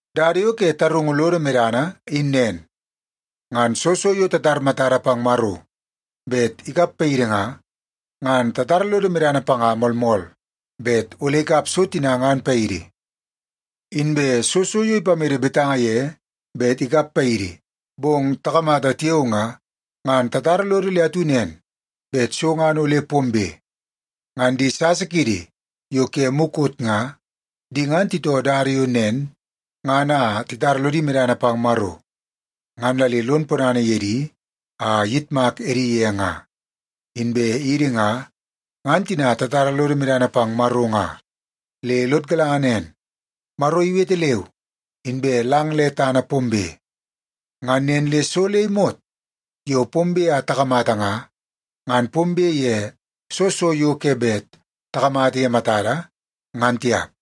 Dada yo ke tarungu lodo medana in nen. Ngan soo so yo tatar matada pang Maro bet ikap paidi nga, ngan tatara lodo medana panga moolmool bet ole ikap so tina ngan paidi. Inbe soo so yo ipamede betanga ye bet ikap paidi, bong takamata tiao nga, ngan tatara lodo le atu nen bet so ngan ole pombe. Ngan di sasa kiidi yo ke mukot nga, di ngan titoo dada yo nen ngan a titara lodi medana pang Maro, ngan la le lon ponana ye di a iyitmak edi ye nga. Inbe idi nga, ngan tina tatara lodo medana pang Maro nga, le lod galanga nen: Maro iwete leu, inbe lang le tana pombe. Ngan nen le so le imot yo pombe a takamata nga, ngan pombe ye soo so yo ke bet takamata ye matada, ngan tiap.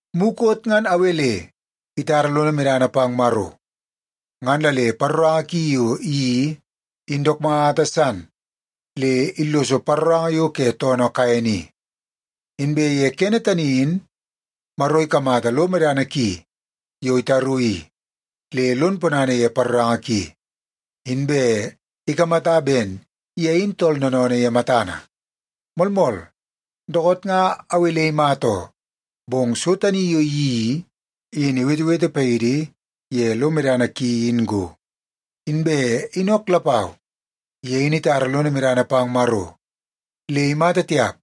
Mukot ngan Awel itara lono medana pang Maro, ngan la le paroranga ki yo iyeii in dook mata san le illoso paroranga yo ke toonoo Kaen i. Inbe ye kene tani in Maro ikamata lo medana ki yo itaru i, le lon ponana ye paroranga ki, inbe ikamata ben ye in tool noonoonoo ye matana. Moolmool, dookoot nga Awel imata oo, bong so tani yo iyeii i, in iwetewete paidi ye lo medana ki in go. Inbe Inok lapau, ye in itara lono medana pang Maro. Le imata tiap,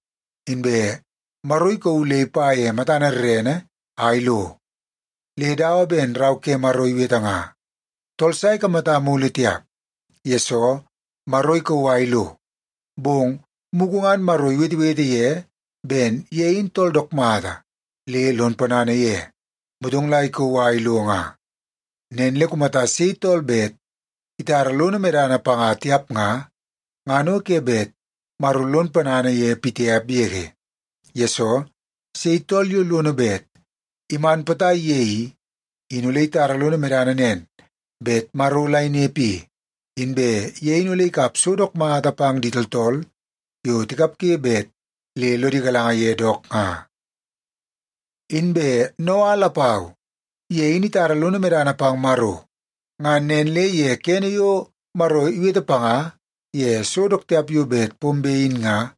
inbe Maro ikauu le ipa matana rrene a ilo. Le dawa ben Rau ke Maro iwete nga, “Tool sa ikamata mulu tiap, yesoo Maro ikauu a ilo.” Bong mugu ngan Maro iwetewete ye ben ye in tooltool dook mata le lon ponana ye, motong la ikauu a ilo nga. Nen le kumata sei tool bet itara lono medana panga tiap nga, ngan o ke bet Maro lon ponana ye pitiap yege. Yesoo, sei tool yo lono bet iman potai ye i, in ole itara lono medana nen bet Maro la inepe i, inbe ye in ole ikap so dook mata pang di tooltool yo tikapge bet le lodi galanga ye dook nga. Inbe Noa lapau, ye in itara lono medana pang Maro. Ngan nen le ye kene yo Maro iwete panga ye so dook tiap yo bet pombe in nga,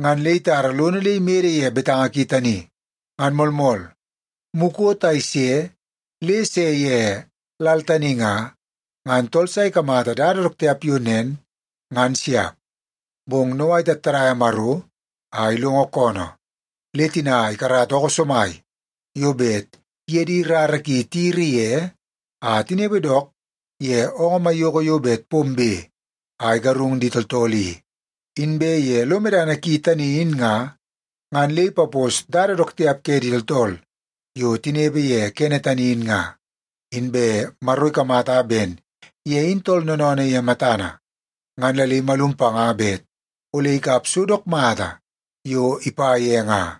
ngan le itara lono le imede ye betanga ki tani. Ngan moolmool, mukot a ise le se ye lal tani nga, ngan tool sa ikamata dada dook tiap yo nen, ngan siap. Bong Noa itattadaia Maro a ilongo koonoo, le tina ikarata ookoo somai yo bet iye di rara ki tiyiri ye a tinepe dook ye oongoo maiyoko yo bet pombe a igarung di tooltool i. Inbe ye lo medana ki tani in nga, ngan le ipapos dada dook tiap ke di tooltool yo tinepe ye kene tani in nga. Inbe Maro ikamata ben ye in tooltool noonoonoo ye matana, ngan la le imalum panga bet ole ikap so dook mata yo ipa ye nga.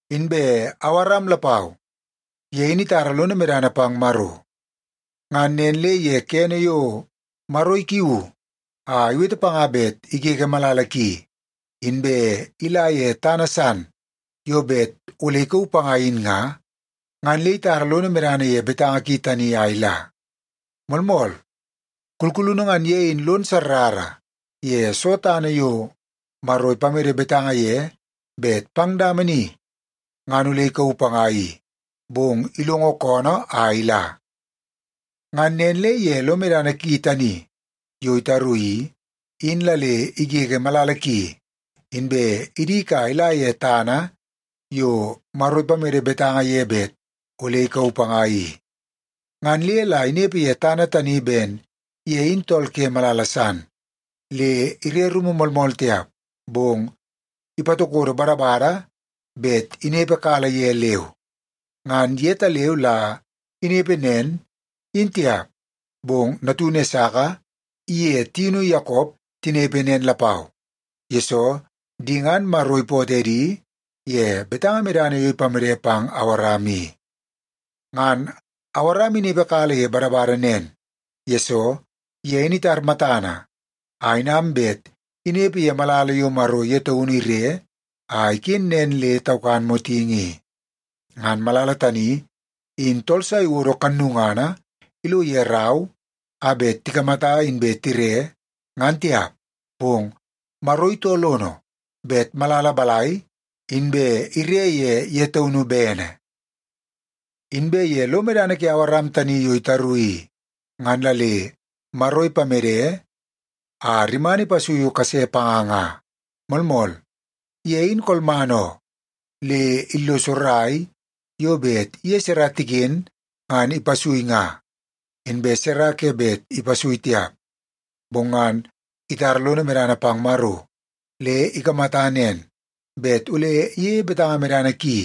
Inbe Awaram lapau, ye in itara lono medana pang Maro. Ngan nen le ye kene yo Maro ikiuu a iwete panga bet igege malala ki inbe ila ye tana san yo bet ole ikauu panga in nga, ngan le itara lono medana ye betanga ki tani a ila. Moolmool, kulkulunu ngan ye in lon sarrara ye soo tana yo Maro ipamede betanga ye bet pang dama ni ngan ole ikauu panga i, bong ilongo koonoo a ila. Ngan nen le ye lo medana ki tani yo itaru i, in la le igege malala ki inbe idik a ila ye tana yo Maro ipamede betanga ye bet ole ikauu panga i. Ngan le la inepe ye tana tani ben ye in tool ke malala san, le ire rumu moolmool tiap, bong ipatokodo badabada bet inepekala ye leu. Ngan yetaleu la inepe nen, in tiap, bong natunu Esaka iye tiunu Yakop tinepe nen lapau, yesoo di ngan Maro ipootoo edi ye betanga medana yo ipamede pang Awaram i. Ngan Awaram inepekala ye badabada nen, yesoo ye in itar matana a inam bet inepe ye malala yo Maro ye taunu ire a iken nen le taukan motingi i. Ngan malala tani in tool sa iwodo kannungana ilo ye rau a bet tikamata inbe tire, ngan tiap, bong Maro itoo lono bet malala balai, inbe ire ye ye taunu bene. Inbe ye lo medana ke Awaram tani yo itaru i, ngan la le Maro ipamede a rimana ipasui kase panga nga. Moolmool, ye in kolman oo, le illoso rai yo bet iye Sara tiken ngan ipasui nga, inbe Sara ke bet ipasui tiap. Bong ngan itara lono medana pang Maro le ikamata nen, bet ole iyeie betanga medana ki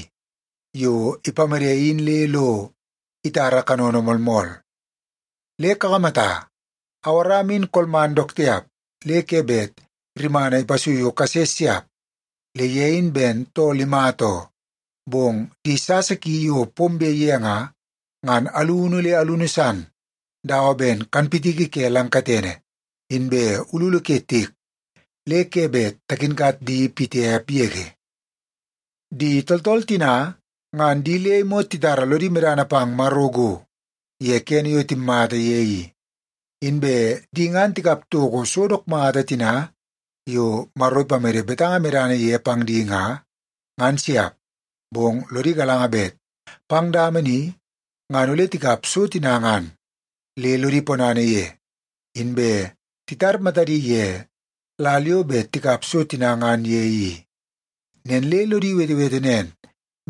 yo ipamede in le lo itara kanono moolmool. Le kakamata, Awaram in kolman dook tiap le ke bet rimana ipasuiu kase siap, le ye in ben tool imata oo. Bong di sasa ki yo pombe ye nga, ngan alunu le alunu san dawa ben kanpitiki ke lang katene, inbe ululu ke tiek le ke bet takinkat di pitiap yege. Di tooltool tina ngan di le imot titara lodi medana pang Maro go, ye kene yo timmata ye i. Inbe di ngan tikap toko so dook mata tina yo Maro ipamede betanga medana ye pang di nga, ngan siap, bong lodi galanga bet pang dama ni ngan ole tikap so tina ngan. Le lodi ponana ye, inbe titar matadi ye lal yo bet tikap so tina ngan ye i. Nen le lodi wetewete nen,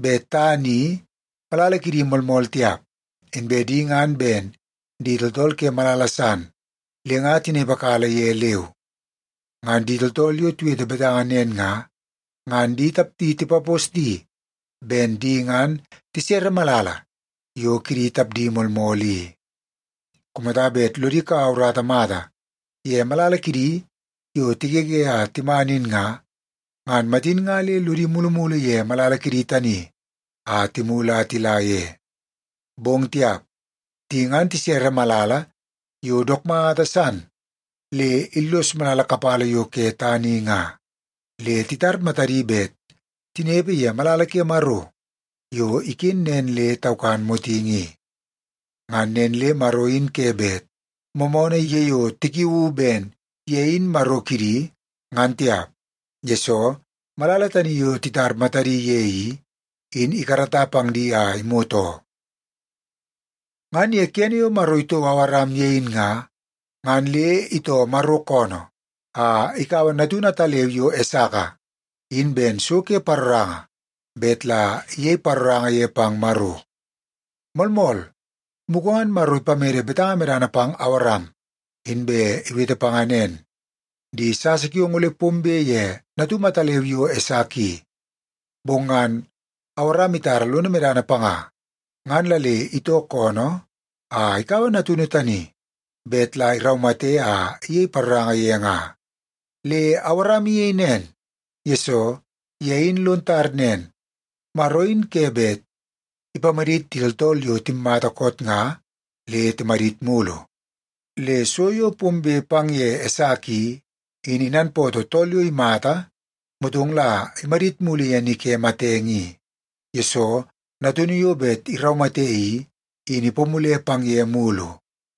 bet tana i malala kidi moolmool tiap, inbe di ngan ben di tooltool ke malala san le nga tinepekala ye leu. Ngan di tooltool yo tiwete betanga nen nga, ngan di tapdi tipapos di ben di ngan tisere malala yo kidi tapdi moolmool i. Kumata bet lodi kaua urata mata ye malala kidi yo tigege a timan in nga, ngan matin nga le lodi mulumulu ye malala kidi tani a timulu a tila ye. Bong tiap! Di ngan tisere malala yo dook mata san le illos malala kapala yo ke tana i nga, le titar matadi bet tinepe ye malala ke Maro yo iken nen le taukan motingi i. Ngan nen le Maro in ke bet moomoonoo ye yo tikiuu ben ye in Maro kidi, ngan tiap, yesoo malala tani yo titar matadi ye i, in ikarata pang di a imot oo. Ngan ye kene yo Maro itouo Awaram ye in nga, ngan le itoo Maro koonoo a ikaua natunu ataleu yo Esaka in ben so ke paroranga bet la iyei paroranga ye pang Maro. Moolmool, mugu ngan Maro ipamede betanga medana pang Awaram, inbe iwete panga nen, “Di sasa kiong ole pombe ye natum ataleu yo Esaka i.” Bong ngan Awaram itara lono medana panga, ngan la le itoo koonoo a ikaua natunu tani bet la iraumate a iyei paroranga ye nga. Le Awaram iyei nen, yesoo ye in lon tar nen, Maro in ke bet ipamadit di tooltool yo timmata koot nga le timadit mulu. Le so yo pombe pang ye Esaka i, in inanpootoo tool yo imata motong la imadit mulu ye ni ke matenge i, yesoo natunu yo bet iraumate i, in ipamule pang ye mulu.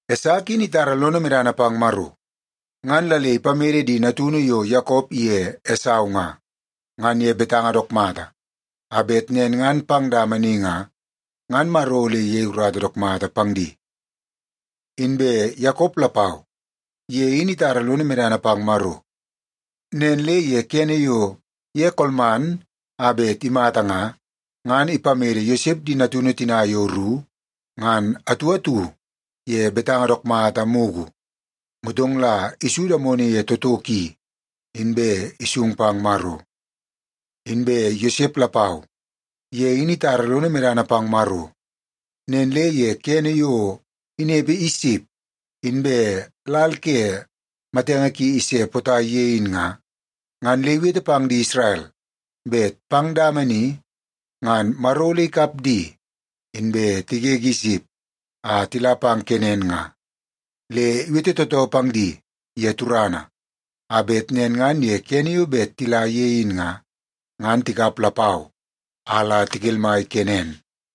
Esaka in itara lono medana pang Maro, ngan la le ipamede di natunu yo Yakop iye Esau nga, ngan ye betanga dook mata, a bet nen ngan pang dama ni nga, ngan Maro ole iyei urata dook mata pang di. Inbe Yakop lapau, ye in itara lono medana pang Maro. Nen le ye kene yo ye kolman a bet imata nga, ngan ipamede Yosep di natunu tina yo ru ngan atu atu ye betanga dook mata mugu. Motong la isu damono ye toto ki, inbe isung pang Maro. Inbe Yosep lapau, ye in itara lono medana pang Maro. Nen le ye kene yo inepe Isip inbe lal ke matenge ki ise potai ye in nga, ngan le iwete pang di Isrel bet pang dama ni ngan Maro ole ikap di, inbe tigege Isip a tila pang Kenan nga. Le iwete tootoo pang di ye turana, a bet nen ngan ye kene yo bet tila ye in nga, ngan tikap lapau a la tikelmai Kenen.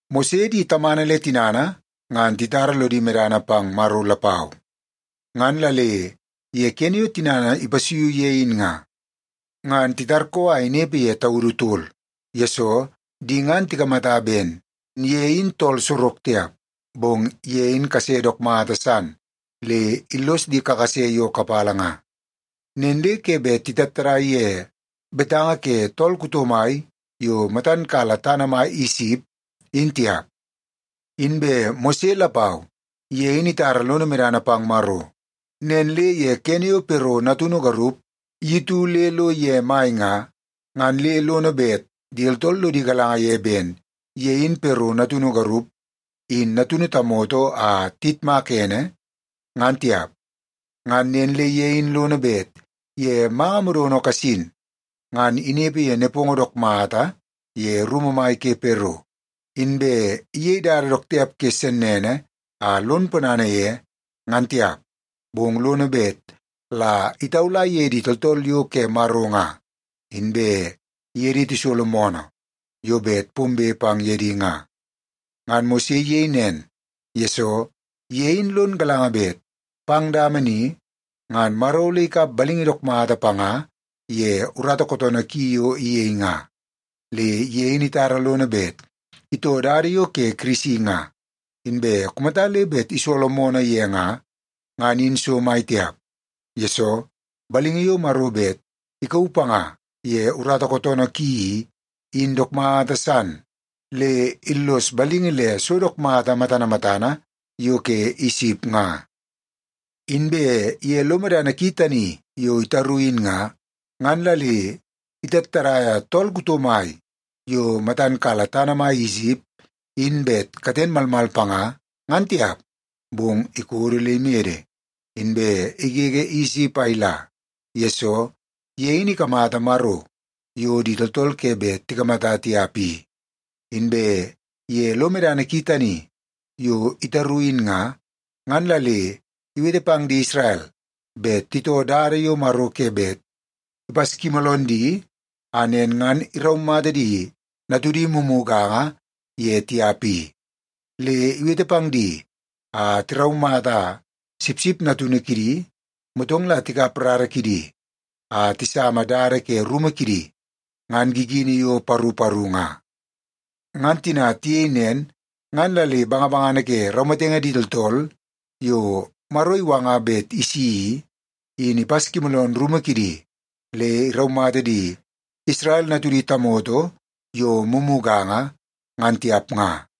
Mose di tamana le tinana ngan titara lodi medana pang Maro lapau. Ngan la le ye kene yo tinana ipasuiu ye in nga, ngan titarkoo a inepe ye taudu tol, yesoo di ngan tikamata ben ye in tool sorok tiap, bong ye in kase dook mata san le illos di kakase yo kapala nga. Nen le ke bet titattadai ye betanga ke tool kuto mai yo matan kala tana mai Isip, in tiap. Inbe Mose lapau, ye in itara lono medana pang Maro. Nen le ye kene yo Pero natunu garup iyutu le lo ye mai nga, ngan le lono bet di tooltool lodi galanga ye ben ye in Pero natunu garup in natunu tamoto a tiyitmaka ene, ngan tiap. Ngan nen le ye in lono bet ye manga modono kasin, ngan inepe ye nepongo dook mata ye rumu mai ke Pero, inbe iyei dada dook tiap ke sennene a lon ponana ye, ngan tiap. Bong lono bet la itaula ye di tooltool yo ke Maro nga, inbe iye di tisolo moonoo yo bet pombe pang ye di nga. Ngan Mose iyei nen, yesoo ye in lon galanga bet pang dama ni, ngan Maro ole ikap balingi dook mata panga ye urata kootoonoo ki yo iyei nga. Le ye in itara lono bet itoo dada yo ke Kirisi nga, inbe kumata le bet isolo moonoo ye nga, ngan in so mai tiap, yesoo balingi yo Maro bet ikauu panga ye urata kootoonoo ki i, in dook mata san le illos balingi le so dook mata matana matana yo ke Isip nga. Inbe ye lo medana ki tani yo itaru in nga, ngan la le itattadaia tool kuto mai yo matan kala tana mai Isip in bet katen malmal panga, ngan tiap. Bong ikodo le imede, inbe igege Isip a ila, yesoo ye in ikamata Maro yo di tooltool ke bet tikamata tiap i. Inbe ye lo medana ki tani yo itaru in nga, ngan la le iwete pang di Isrel bet titoo dada yo Maro ke bet ipaskimooloon di a nen ngan iraumata di natudi mumuganga ye tiap i. Le iwete pang di a tiraumata sipsip natunu kidi, motong la tikap rara kidi a tisama dada ke rumu kidi ngan gigini yo paru paru nga. Ngan tina tiyei nen, ngan la le bangabangana ke raumatenge di tooltool yo Maro iwanga bet isi i, in ipaskimooloon rumu kidi, le iraumata di Isrel natudi tamoto yo mumuganga, ngan tiap nga.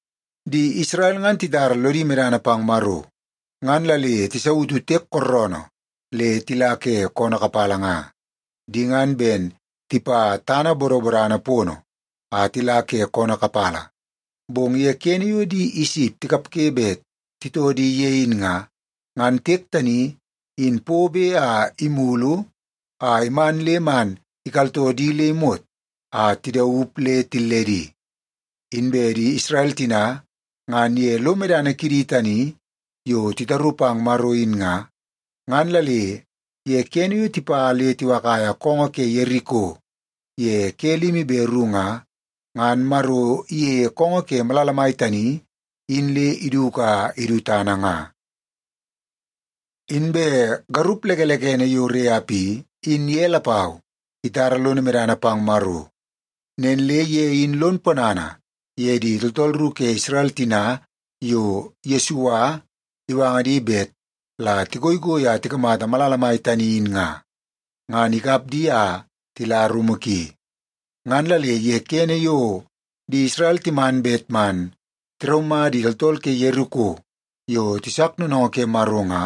Di Isrel ngan titara lodi medana pang Maro, ngan la le tisautu tiek kooroonoo le tila ke koonoo kapala nga. Di ngan ben tipa tana bodobodana pono a tila ke koonoo kapala, bong ye kene yo di Isip tikapge bet titoo di ye in nga, ngan tiek tani in pobe a imulu a iman le man ikaltoo di le imot a tidaup le tilledi. Inbe di Isrel tina ngan ye lo medana kidi tani yo titaru pang Maro in nga, ngan la le ye kene yo tipa le tiwakaia koongoo ke Yeriko ye ke limi be ru nga, ngan Maro iyeie koongoo ke malala tani in le iduku a idu tana nga. Inbe garup lekelekene yo Reap i, in ye lapau itara lono medana pang Maro. Nen le ye in lon ponana ye di tooltool ru ke Isrel tina yo Yesua iwanga di bet la tigoigoi a tikamata malala mai tani in nga, ngan ikap di a tila rumu ki. Ngan la le ye kene yo di Isrel timan bet man tiraumata di tooltool ke Yeriko yo tisak noonoongoo ke Maro nga,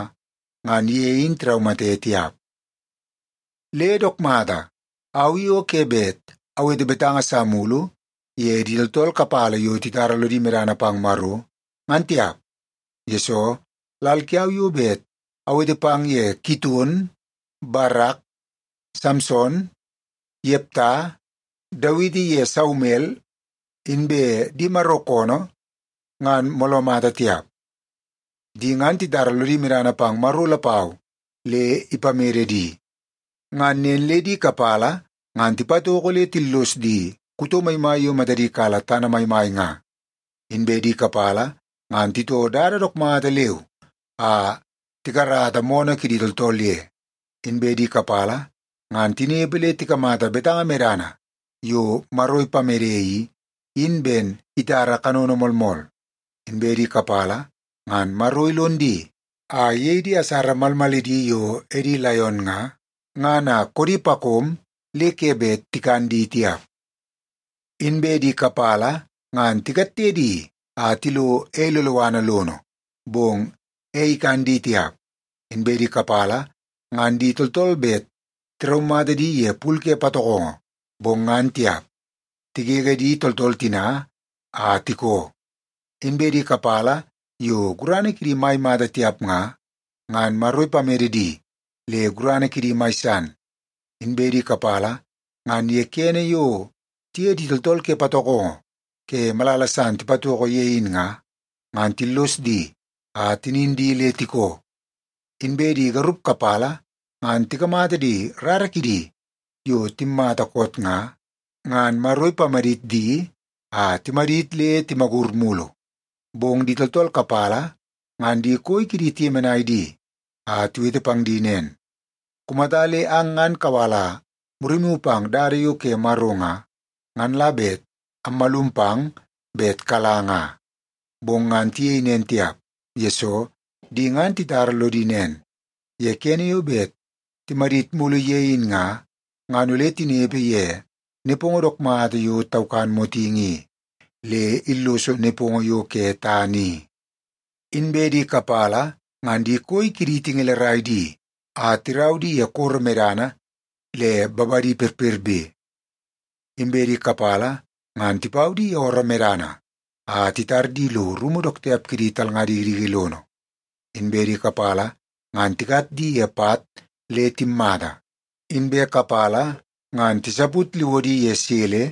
ngan ye in tiraumate tiap. Le dook mata, au i o ke bet awete betanga sa mulu ye di tooltool kapala yo titara lodi medana pang Maro, ngan tiap, yesoo lal kiau yo bet awete pang ye Kiton, Barak, Samson, Yepta, Dawiti ye Saumel inbe di Maro koonoo ngan mooloo mata tiap. Di ngan titara lodi medana pang Maro lapau le ipamede di. Ngan nen le di kapala ngan tipatoko le tillos di kuto maimai yo matadi kala tana maimai nga. Inbe di kapala ngan titoo dada dook mata leu a tikarata moonoo kidi tooltool ye. Inbe di kapala ngan tinepe le tikamata betanga medana yo Maro ipamede i, in ben itara kanono moolmool. Inbe di kapala ngan Maro ilon di a iyei di asara malmalidi yo edi laion nga, ngan a koodi pakom le ke bet tikan di tiap. Inbe di kapala ngan tikatte di a tilo ei loloana lono, bong ei ikan di tiap. Inbe di kapala ngan di tooltool bet tiraumata di ye pul ke patokongo, bong ngan tiap. Tigege di tooltool tina a tikoo. Inbe di kapala yo gurana kidi mai mata tiap nga, ngan Maro ipamede di le gurana kidi mai san. Inbe di kapala ngan ye kene yo tiye di tooltool ke patokongo ke malala san tipatoko ye in nga, ngan tillos di a tinin di le tikoo. Inbe di garup kapala ngan tikamata di rara kidi yo timmata koot nga, ngan Maro ipamadit di a timadit le timagur mulu. Bong di tooltool kapala ngan di koi kidi tiyemenai di a tiwete pang di nen, “Kumata le ang ngan kawala murimu pang dada yo ke Maro nga, ngan la bet ammalum pang bet kala nga.” Bong ngan tiyei nen tiap, yesoo di ngan titara lodi nen, ye kene yo bet timadit mulu ye in nga, ngan ole tinepe ye nepongo dook mata yo taukan motingi i, le illoso nepongo yo ke tana i. Inbe di kapala ngan di koi kidi tingelerai di a tirau di ye koro medana le babadi perperbe. Inbe di kapala ngan tipau di ye ooroo medana a titar di lo rumu dook tiap ke di talnga dikidiki lono. Inbe di kapala ngan tikat di ye pat le timmata, inbe kapala ngan tisaput liwodi ye sele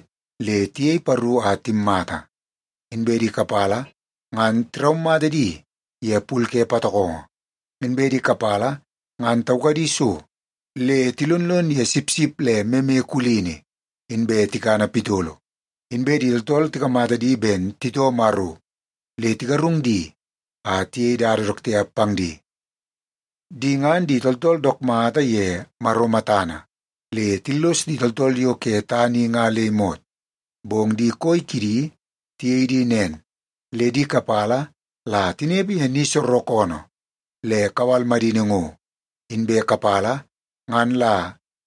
le tiyei paru a timmata. Inbe di kapala ngan tiraumata di ye pul ke patokongo. Inbe di kapala ngan taukadi so, le tilonlon ye sipsip le meme kulini, inbe tikana pitolo. Inbe di tooltool tikamata di ben titoo Maro, le tigarung di a tiyei dada dook tiap pang di. Di ngan di tooltool dook mata ye Maro matana, le tillos di tooltool yo ke tana i nga le imot. Bong di koi kidi tiyei di nen, le di kapala la tinepe ye ni soorookoonoo le kawal madini ngo, inbe kapala ngan la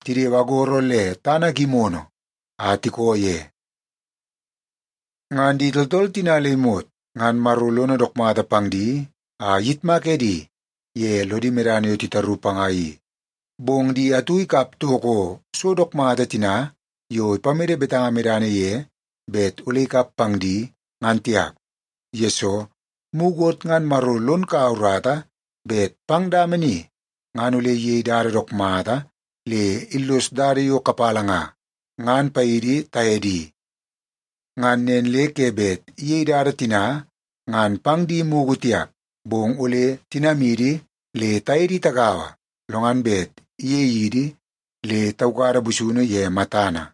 tidewe agoro le tana gimono a tiko ye. Ngan di tooltool tina le imot ngan Maro lono dook mata pang di a iyitmak edi ye lodi medana yo titaru panga i, bong di atu ikap toko so dook mata tina yo ipamede betanga medana ye bet ole ikap pang di, ngan tiap. Yesoo, mukot ngan Maro lon kaua urata bet pang dama ni ngan ole iyei dada dook mata le illos dada yo kapala nga, ngan paidi taye di. Ngan nen le ke bet iyei dada tina ngan pang di mugu tiap, bong ole tinamidi le taye di tagaua, lo ngan bet iyei idi le taukada busunu ye matana.